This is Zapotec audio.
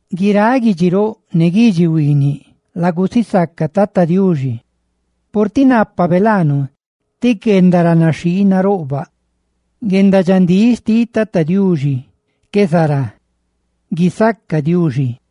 Guiráꞌ guidxi roꞌ ne guidxi huiiniꞌ, lagusisaca Tata Diuxi, purtiꞌ nápabe laanu ti guendaranaxhii naroꞌbaꞌ; ¡guendadxandíꞌ xtiꞌ Tata Diuxi qué zará! ¡Guisaca Diuxi!